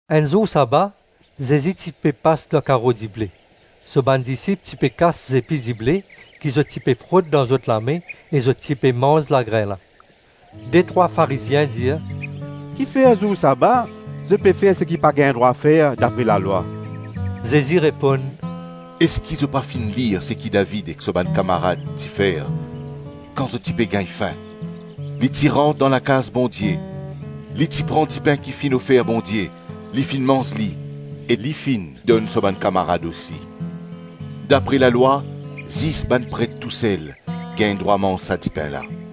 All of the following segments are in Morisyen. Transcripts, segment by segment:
Enn zour saba, Zezi ti pe pas dan karo dible, so bann disip ti pe kas zepi dible, ki zot ti pe frot dan zot lame e zot ti pe manz lagrin la. Detrwa Farizien dir, “Kifer zour saba zot pe fer seki pa gagn drwa fer dapre lalwa?” Zezi reponn, “Eski zot pa finn lir seki David ek so bann kamarad ti fer kan zot ti pe gagn fin? Li ti rant dan lakaz Bondie, li ti pran dipin ki finn ofer Bondie, li finn manz li e li finn donn so bann kamarad osi. Dapre lalwa zis bann pret tousel gagn drwa manz sa dipin la.”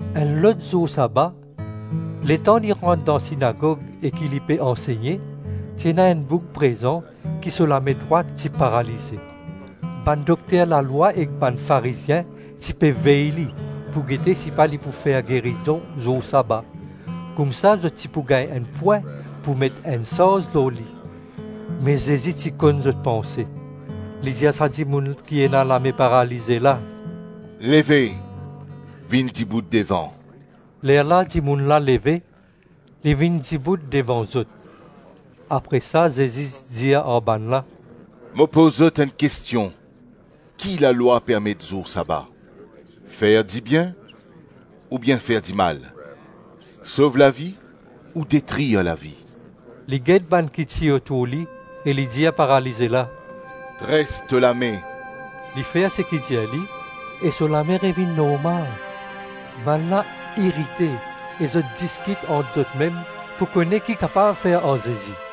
Enn lot zour saba, letan li rant dan sinagog e ki li ti pe ansegne, ti ena enn boug prezan ki so lame drwat ti paralize. Bann dokter lalwa ek bann Farizien ti pe vey li, pou gete si pa li pou fer gerizon zour saba; koumsa zot ti pou gagn enn pwin pou met enn sarz lor li. Me Zezi ti konn zot panse, li dir sa dimoun ki ena lame paralize la, “Leve vinn dibout devan.” Lerla dimoun la leve, li vinn dibout devan zot. Apre sa Zezi dir ar bannla, “Mo poz zot enn kestion: ki lalwa permet zour saba? Fer dibien oubien fer dimal? Sov lavi ou detrir lavi?” Li get bann ki ti otour li, e li dir paralize la, “Dres to lame.” Li fer seki dir li, e so lame revinn normal. Bannla irite e zot diskit ant zotmem pou kone ki kapav fer ar Zezi.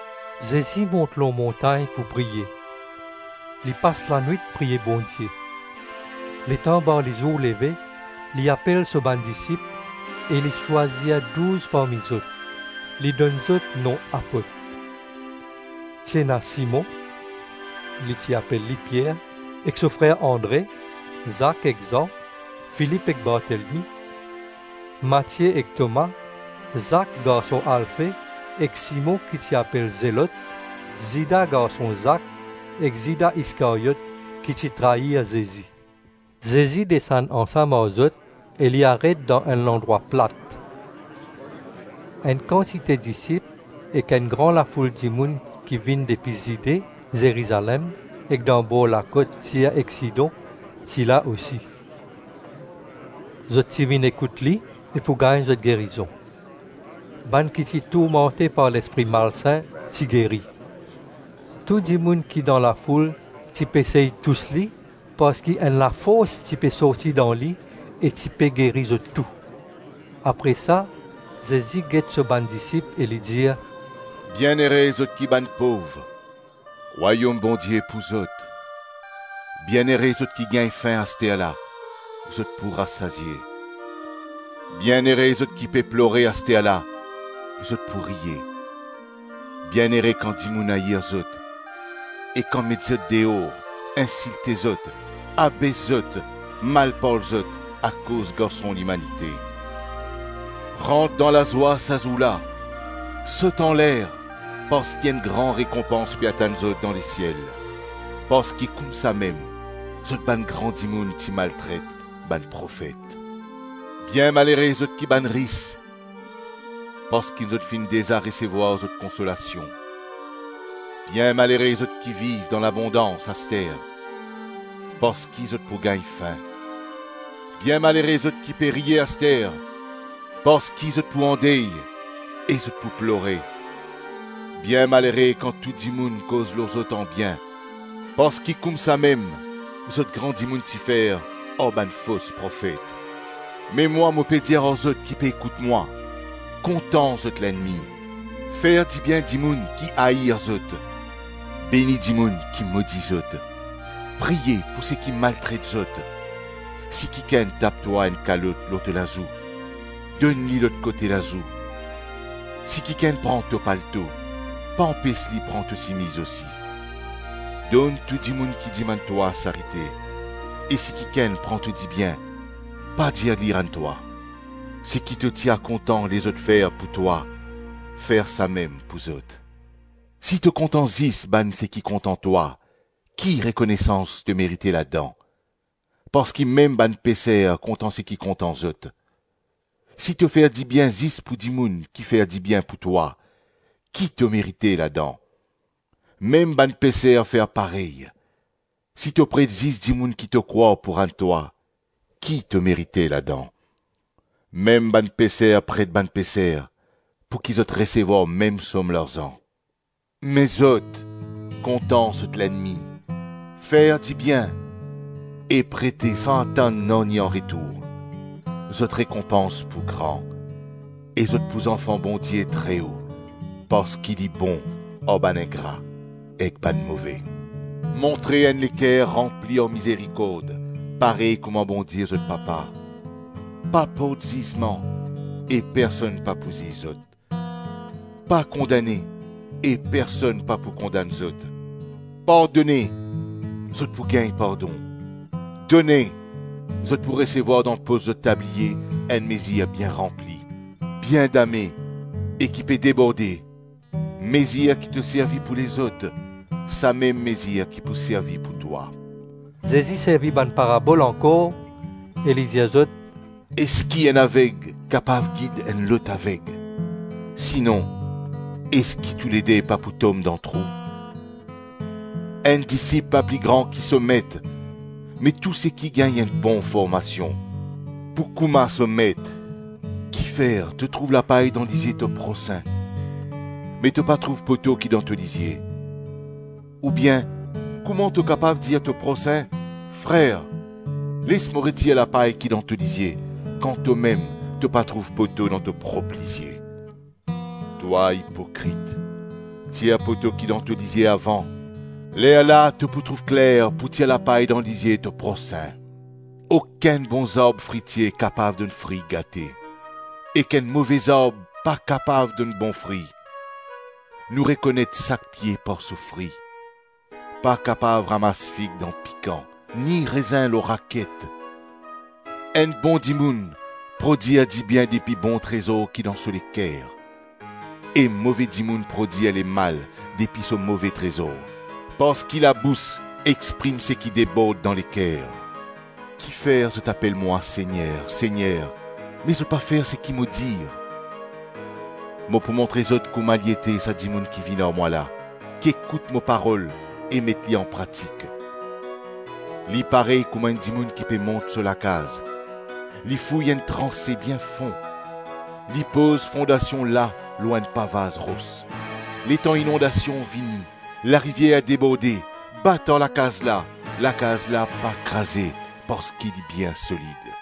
Zezi mont lor montagn pou priye. Li pas lanwit priye Bondie. Letan barlizour leve, li apel so bann disip, e li swazir douz parmi zot, li donn zot nom apot. Ti ena Simon - li ti apel li Pier - ek so frer Andre, Zak ek Zan, Filip ek Bartelmi, Matie ek Toma, Zak garson Alfe ek Simon ki ti apel Zelot, Zida garson Zak ek Zida Iskaryot, ki ti trair Zezi. Zezi desann ansam ar zot e li aret dan enn landrwa plat. Enn kantite disip ek enn gran lafoul dimoun ki vinn depi Zide, Zerizalem ek danbor lakot Tir ek Sidon ti la osi. Zot ti vinn ekout li e pou gagn zot gerizon. Bann ki ti tourmante par lespri malsin ti geri. Tou dimoun ki dan lafoul ti pe sey tous li, parski enn lafors ti pe sorti dan li e ti pe geri zot tou. Apre sa Zezi get so bann disip e li dir, “Bienere zot ki bann pov, Rwayom Bondie pou zot. Bienere zot ki gagn fin asterla, zot pou rasazie. Bienere zot ki pe plore asterla, zot pou riye. Bienere kan dimoun air zot, e kan met zot deor, insilte zot, abes zot, mal parl zot akoz Garson Limanite. Rant dan lazwa sa zour la, sot anler, parski enn gran rekonpans pe atann zot dan lesiel; parski koumsamem zot bann gran dimoun ti maltret bann profet. Bienmalere zot ki bann ris parski zot finn deza resevwar zot konsolasion. Bienmalere zot ki viv dan labondans aster, parski zot pou gagn fin. Bienmalere zot ki pe riye aster, parski zot pou andey e zot pou plore. Bienmalere kan tou dimoun koz lor zot anbien, parski koumsamem zot gran dimoun ti fer ar bann fos profet. “Me mwa mo pe dir ar zot ki pe ekout mwa, kontan zot lennmi, fer dibien dimoun ki air zot, beni dimoun ki modi zot, priye pou seki maltret zot. Si kikenn tap twa enn kalot lor to lazou, donn li lot kote lazou; si kikenn pran to palto, pa anpes li pran to simiz osi. Donn tou dimoun ki dimann twa sarite; e si kikenn pran to dibien, pa dir li rann twa. Seki to ti a kontan lezot fer pou twa, fer samem pou zot. Si to kontan zis bann seki kontan twa, ki rekonesans to merite ladan? Parski mem bann peser kontan seki kontan zot. Si to fer dibien zis pou dimoun ki fer dibien pou twa, ki to merite ladan? Mem bann peser fer parey. Si to pret zis dimoun ki to krwar pou rann twa, ki to merite ladan? Mem bann peser pret bann peser, pou ki zot resevwar mem som larzan. Me zot, kontan zot lennmi, fer dibien, e prete san atann nanye anretour. Zot rekonpans pou gran, e zot pou zanfan Bondie Treo parski li bon ar bann ingra ek bann move. Montre enn leker ranpli ar mizerikord parey kouma Bondie zot Papa.” “Pa port zizman e personn pa pou ziz zot; pa kondane e personn pa pou kondann zot. Pardone, zot pou gagn pardon. Done, zot pou resevwar dan pos zot tabliye enn mezir bien ranpli, bien dame e ki pe deborde; mezir ki to servi pou lezot, samem mezir ki pou servi pou twa.” Zezi servi bann parabol ankor e li dir zot, “Eski enn aveg kapav gid enn lot aveg? Sinon eski toulede pa pou tom dan trou? Enn disip pa pli gran ki so met, me tou seki gagn enn bon formasion pou kouma so met. Kifer to trouv lapay dan lizie to prosin, me to pa trouv poto ki dan to lizie? Oubien, kouma to kapav dir to prosin, ‘Frer, les mo retir lapay ki dan to lizie,’ kan tomem to pa trouv poto dan to prop lizie? Twa ipokrit, tir poto ki dan to lizie avan, lerla to pou trouv kler pou tir lapay dan lizie to prosin. “Okenn bon zarb fritie kapav donn fri gate, ek enn move zarb pa kapav donn bon fri; nou rekonet sak pie par so fri. Pa kapav ramas fig dan pikan, ni rezin lor raket. Enn bon dimoun prodwir dibien depi bon trezor ki dan so leker, e move dimoun prodwir lemal depi so move trezor; parski labous exprim seki debord dan leker. “Kifer zot apel mwa Segner, Segner, me zot pa fer seki mo dir? Mo pou montre zot kouma li ete sa dimoun ki vinn ar mwa la, ki ekout mo parol e met li anpratik. Li parey kouma enn dimoun ki pe mont so lakaz. Li fouy enn transe bien fon, li poz fondasion la lor enn pavaz ros; letan inondasion vini, larivier deborde, bat ar lakaz la; lakaz la pa kraze parski li bien solid.